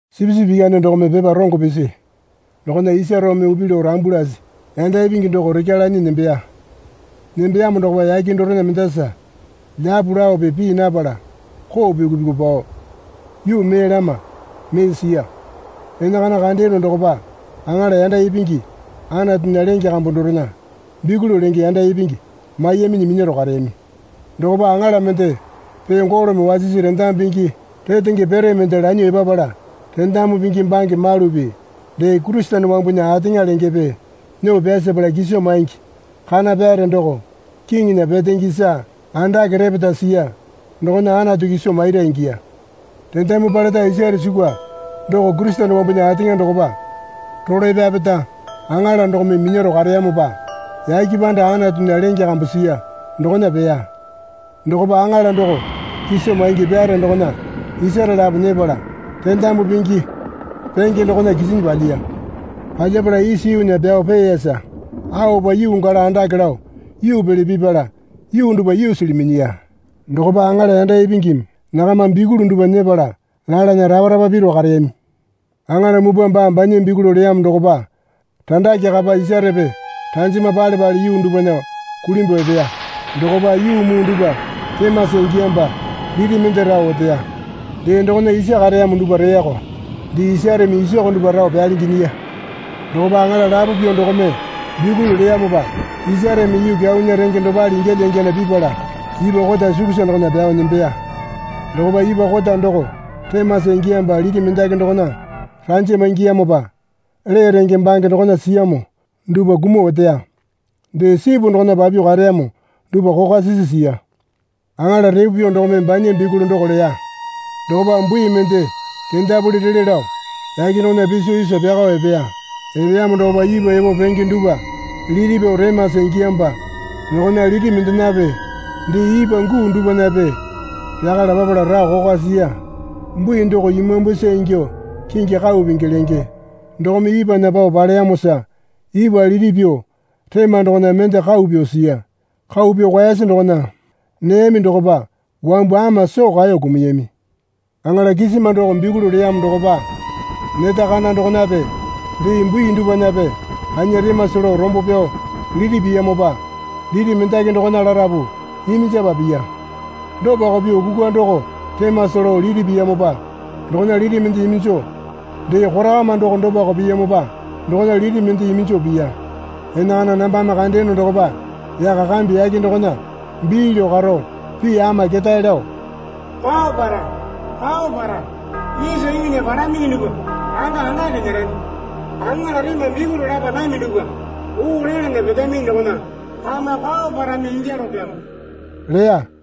Sipisipi Ikyane dokome pepa rongo pisi dokona isa roome upi lao rambu lasi yanda ipingi doko rekya lanyi nembeya. Nembeyamo dokopa yake dorena mendasa lyapu laope pii napala koo pyuku pyuku pao yuu mee lama mee siya. Enakana kandeyono dokopa aŋala yanda ipingi Anatunya lenge kambu dorena bikuli lenge yanda ipingi maiyaminyi minyaro kareyami. Dokopa aŋala mende pee golome wasisi rendamu pingi retenge pere mende lanyuo epapala rendamu pingi bange malupi dee Kurisene wambunya ateŋa lengepe nyuo pyasapala kiso maingi kana pyare doko kiŋinya petenge isa andake repeta siya dokona Anatu kiso maira ingiya. Rendamu paleta isare sukwa doko Kurisene wambunya ateŋa dokopa rolae pyapeta aŋala dokome minyaro kareyamopa yake panda Anatunya lenge kambu siya dokona peya. Dokopa aŋala doko kiso maingi pyare dokona isare lapo nyepala rendamu pingi penge dokona kisinyi palyiya. Palyapala isa yuunya pyao peeyara aopa yuu gala andake lao yuu pele pipala yuu dupwa yuusili minyiya. Dokopa aŋala yanda ipingimi nakama bikuli dupwa nyepala lalana rapa rapa piru kareyami. Aŋala mupwa baa banya bikuli leyamo dokopa randake kapa isarepe ranjama pale pale yuu dupwana kulimbuo epeya. Dokopa yuu muu dupwa remasa ingiyamopa liti mende rao oteya. Dee dokona isa kareyamo dupwa reyako. Dee isareme isoko dupwa rao pyalingi nyiya. Dokopa aŋala lapo pyuo dokome bikuli leyamopa isareme yuu kyaunya renge dopale ingyalya ingyana pipala ipwa kota sukusa dokona pyao nembeya. Dokopa ipwa kota doko remasa ingiyamopa liti mendaki dokona ranjama ingiyamopa lee renge bange dokona siyamo dupwa kumuo oteya. Dee sipu dokona papyuo kareyamo dupwa kokwa sisi siya. Aŋala repo pyuo dokome banya bikuli doko leya. Dokopa bui mende kendapuli rele lao yake dokona piso isa pyakao epeya. Epeyamo dokopa ipwa epo penge dupwa liti pyuo remasa ingiyamopa dokona liti mendenape dee ipwa guu dupwanape pyakala papala rao kokwa siya. Bui doko imambusa ingyuo (kingi Kau Pingi lenge) dokome ipwana pao paleyamosa ipwa liti pyuo rema dokona mende kau pyuo siya. Kau pyuo kwaese dokona neyami dokopa wambu ama soo kaeyo kumuyami. Aŋala kisima doko bikuli leyamo dokopa neta kana dokonape dee bui dupwanape kanya remasa lao rombo pyao liti piyamopa liti mendaki dokona larapu iminjapa piya. Dopako pyuo kukwa doko remasa lao liti piyamopa dokona liti mende iminjo, dee korakama doko dopako piyamopa dokona liti mende iminjo piya. Enakana nambame kandeyono dokopa yaka kambe yake dokona bii lao karo pii ama ketae lao, Kwao para, kwao para, isa yuunya palaminyi dupwa randa andake nyerami. Aŋala rema bikuli lapa nami dupwa oo lalana petaminyi dokona kama kwao parami ingyalopyamo leya.